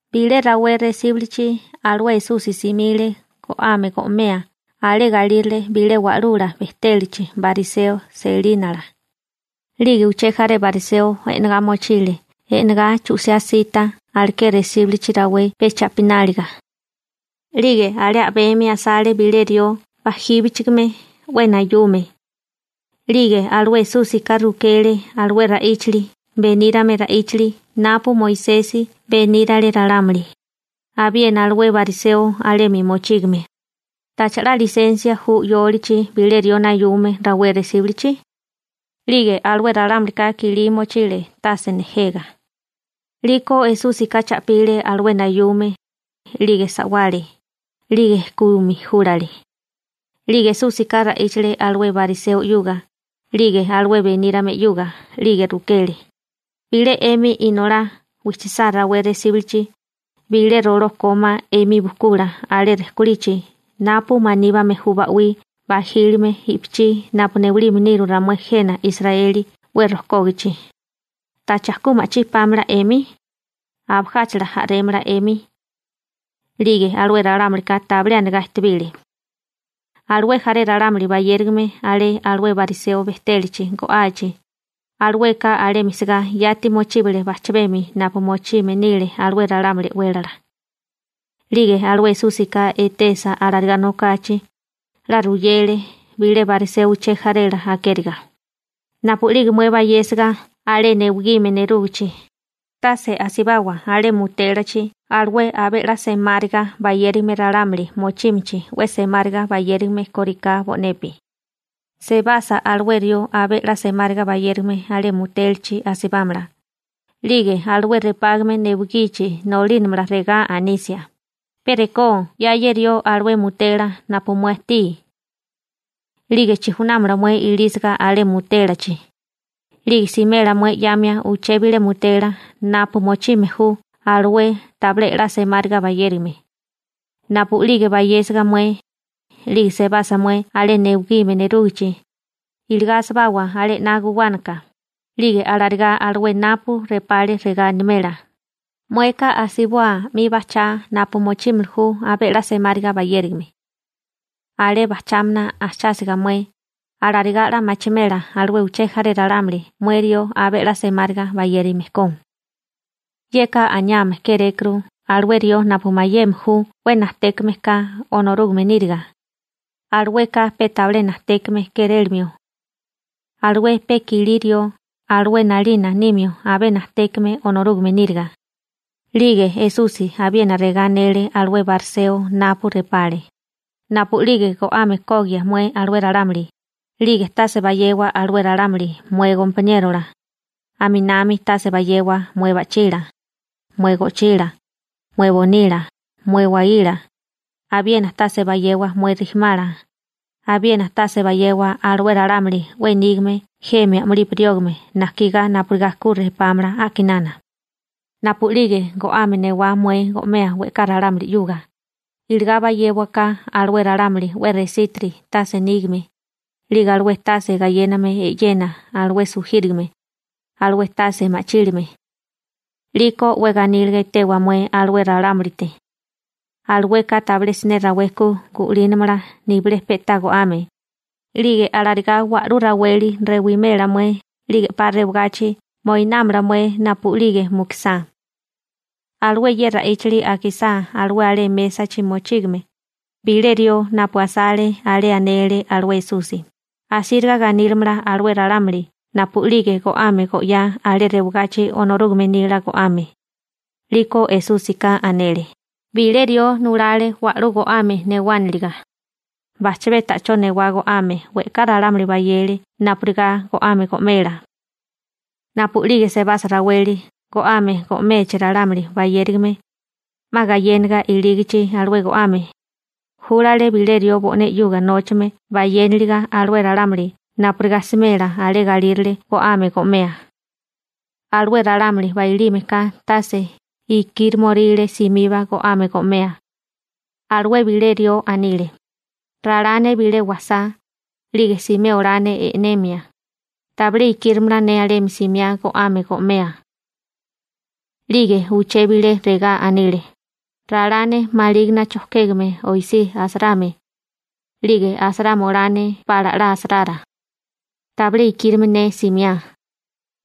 Bilé rawé resíbulichi alué Esusi simile go'ame go'mea alé galírale bilé wa'lula bejtélachi bariseo selínala, 'lige uché jaré bariseo e'negá mochile e'negá chu'siá sita aleké resíbulichi rawé pe cha'pináliga. 'Lige alé a'bemi asale bilé rió bajíbichigime, 'we nayume. 'Lige alué Esúsika rukele alué ra'íchali benírame ra'íchali napu Moisesi benírale ralámuli, abiena alué bariseo alemi mochígame: ―¿Tacha 'la lisensia ju 'yólichi bilé rió nayume rawé resíbulichi? 'Lige alué ralámulika kilí mochile tase nejega. 'Liko Esúsika cha'pile alué nayume, 'lige sa'wale, 'lige kumi júlale. 'Lige Esúsika ra'íchale alué bariseo 'yuga 'lige alué benírame 'yuga, 'lige rukele: ―Bilé 'emi inolá wijchisá rawé resíbulichi, bilé roló kómá 'emi bujkula alé rejkolichi napu maníbame ju ba'wí bajílime i'pichí napu newalime niru ramué jena Israeli 'we rojkógachi, ¿tacha ku ma'chí pámala 'emi? ¿Abajáchala a'rémala 'emi? 'Lige alué ralámulika tabilé anigá ejtebile. Alué jaré ralámuli bayérigame alé alué bariseo bejtélachi go'achi, alueka alemi sigá yati mochíbale bajchami napu mochime nile alué ralámuli e'wélala. 'Lige alué Esúsika etesa alarigá nokachi, 'la ruyele bilé bariseo uché jarela akériga: ―Napu'lige mué bayésiga alé newigime nerúgichi, tase asibawa alé mutélachi alué abé 'la semáriga bayérigame ralámuli mochímichi 'we semáriga bayérigame kóriká bo'nepi. Sebasa alué rió abé 'la semáriga bayérigame alé mutélachi asibámala, 'lige alué repágame newigichi nolínamala regá anisia: «Pe rekó 'ya ye rió alué mutela napu mué ajtí.» 'Lige chijunámala mué ilísiga alé mutélachi, 'lige simela mué 'yamia uché bilé mutela napu mochime ju alué tabilé 'la semáriga bayérigame. Napu'lige bayésiga mué, 'lige sebasa mué alé newigime nerúgichi, iligá asibawa alé 'na guwánaka, 'lige alarigá alué napu repale regá animela: «Mueka asiboa 'mi bajchá napu mochímili ju abé 'la semáriga bayérigame.» Alé bajchámana ajchásiga mué, alarigá 'la machimela alué uché jaré ralámuli mué rió abé 'la semáriga bayérigame ko. Yeka aniame kérékuru alué rió napu mayeme ju 'we najtékame ka Onorúgame níriga, alueka pe tabilé najtékame kérélamio. Alué pe kilí rió, alué 'nalina nímio abé najtékame Onorúgame níriga. 'Lige Esusi abiena regá anele alué bariseo napu repale: ―Napu'lige go'ame kogia mué alué ralámuli, 'lige tase bayewa alué ralámuli mué gompaniérola, aminami tase bayewa mué ba'chila, mué go'chila, mué bonila, mué waíla, abiena tase bayewa mué rijimala, abiena tase bayewa alué ralámuli 'we nígame jemi a'mulipi riógame najkigá napurigá ku repámala a'kinana. Napu'lige go'ame newá mué go'mea we'ká ralámuli 'yuga, iligá bayéwaká alué ralámuli 'we resítiri tase nígame, 'lige alué tase gayéname e'yena, alué sujírigame, alué tase ma'chílime. 'Liko 'we ganíliga etewa mué alué ralámulite. Alueka tabilé siné rawé ku gu'línamala nibilé pe'tá go'ame, 'lige alarigá wa'lú raweli rewimela mué 'lige 'pa rewagachi moinámala mué napu'lige mukusá. Alué ye ra'íchali akisá alué alé mésachi mochígame, bilé rió napu asale alé anele alué Esusi: ―Asíriga ganílimala alué ralámuli napu'lige go'ame go'yá alé rewagachi Onorúgame nila go'ame. 'Liko Esúsika anele: ―Bilé rió nulale wa'lú go'ame newániliga. Bajchabé ta'chó newá go'ame we'ká ralámuli bayele napurigá go'ame go'mela. Napu'lige sebasa raweli go'ame go'mechi ralámuli bayérigame, 'ma gayéniga ilígichi alué go'ame, júlale bilé rió bo'né 'yuga nóchame bayéniliga alué ralámuli napurigá smela alé galírale go'ame go'mea. Alué ralámuli bailime ka tase ikíromoríle simiba go'ame go'mea. Alué bilé rió anile: «Ralá ne bilé wasá, 'lige simé olá ne e'nemia, tabilé ikírimala ne alemi simiá go'ame go'mea.» 'Lige uché bilé regá anile: «Ralá ne malígana chojkégame oisí asarame, 'lige asarama olá ne pala 'la asarara. Tabilé ikírime ne simiá.»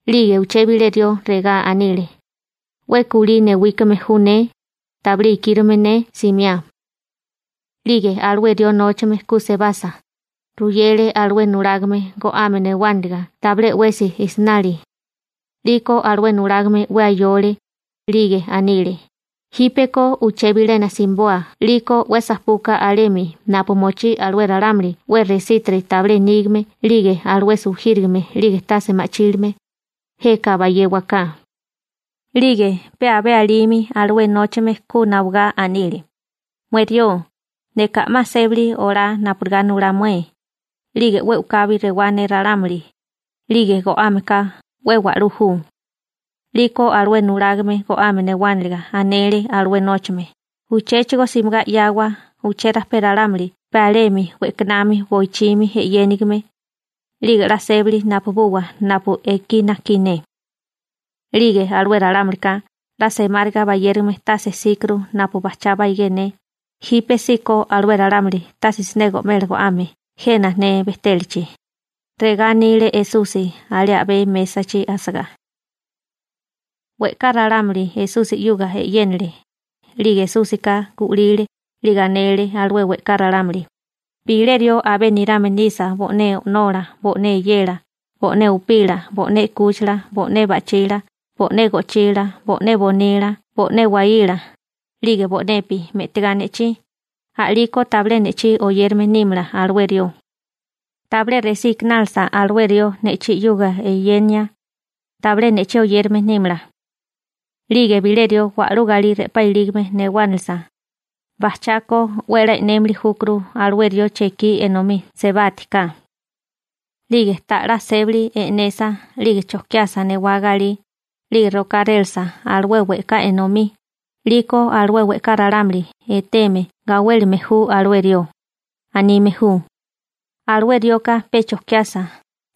'Lige uché bilé rió regá anile: «'We kulí newíkame ju ne, tabilé ikírime ne simiá.» 'Lige alué rió nóchame ku sebasa, ruyele alué nulágame go'ame newániliga tabilé 'wesi jsnali. 'Liko alué nulágame 'we ayole, 'lige anile: «Jípeko uché bilena simiboa 'liko 'we sajpuka alemi napu mochí alué ralámuli 'we resítiri tabilé nígame 'lige alué sujírigame 'lige tase ma'chílime, jeka bayéwaká.» 'Lige pe abé alimi alué nóchame ku nawagá anile: «Mué rió, neka a'má sébali olá napurigá nulá mué, 'lige 'we u'kabi rewá ne ralámuli, 'lige go'ame ka 'we wa'lú ju.» 'Liko alué nulágame go'ame newániliga anele alué nóchame: «Uchéchigo simigá 'yawa uchérajpé ralámuli pe alemi we'kanami boichimi e'yénigime, 'lige 'la sébali napabuwa napu ekí najkí ne. 'Lige alué ralámulika 'la semáriga bayérigame tase jsíkuru napu bajchá baigé ne, jípesíko alué ralámuli tase siné go'mela go'ame jena ne bejtélachi» ―regá anile Esusi alé a'bé mésachi asagá. We'ká ralámuli Esusi 'yuga e'yénale, 'lige Esúsika gu'lile 'lige anele alué we'ká ralámuli: ―Bilé rió, abé nirame nisa bo'né o'nola, bo'né eyela, bo'né upila, bo'né 'kúchila, bo'né ba'chila, bo'né go'chila, bo'né bonila, bo'né waíla, 'lige bo'nepi, me'tigá ne'chí, a'lígeko tabilé ne'chí oyérame nímala alué rió. Tabilé resí ikinálasa alué rió ne'chí 'yuga eyenia, tabilé ne'chí oyérame nímala. 'Lige bilé rió wa'lú galí re'pá ilígame newánilisa, bajchako 'we a'lá e'némili júkuru alué rió chekí enomí sebátiká. 'Lige ta'lá sébali e'nesa 'lige chojkiasa newá galí, 'lige rokárélasa alué we'ká enomí, 'liko alué we'ká ralámuli etéeme gawélime ju alué rió. Anime ju: «Alué rioka pe chojkiasa,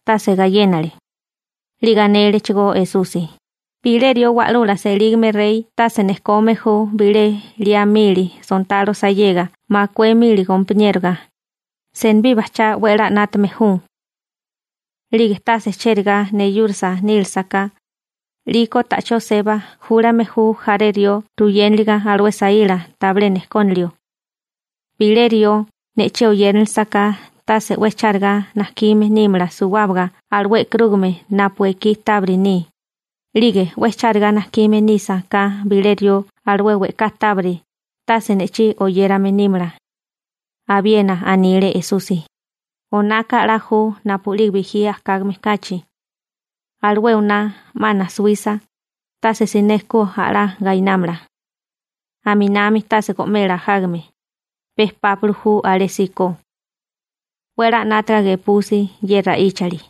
tase gayénale.» 'Lige anélechigó Esusi: ―Bilé rió wa'lula selígame rey tase nejkome ju bilé liá mili sontalo sayega makué mili gompaniéroga, senibí bajchá 'we a'lá 'nátame ju. 'Lige tase chérigá neyúrasa nílasa ka, 'liko ta'chó seba, júlame ju jaré rió ruyéniliga alué saíla tabilé nejkónilio. Bilé rió ne'chí oyérinilisa ka tase 'we chárigá najkime nímala suwábaga alué e'karúgame napu ekí tábiri ni. 'Lige 'we chárigá najkime nisa ka bilé rió alué we'ká tábiri, tase ne'chí oyérame nímala. Abiena anile Esusi: ―Onaka 'la ju napu'lige bijí ajkágame kachi. Alué oná 'ma najsuwisa, tase siné ku a'lá gainámala. Aminami tase go'mela ajágame, pe pápili ju alésíko. 'We a'lá 'nátaga gepusi ye ra'íchali.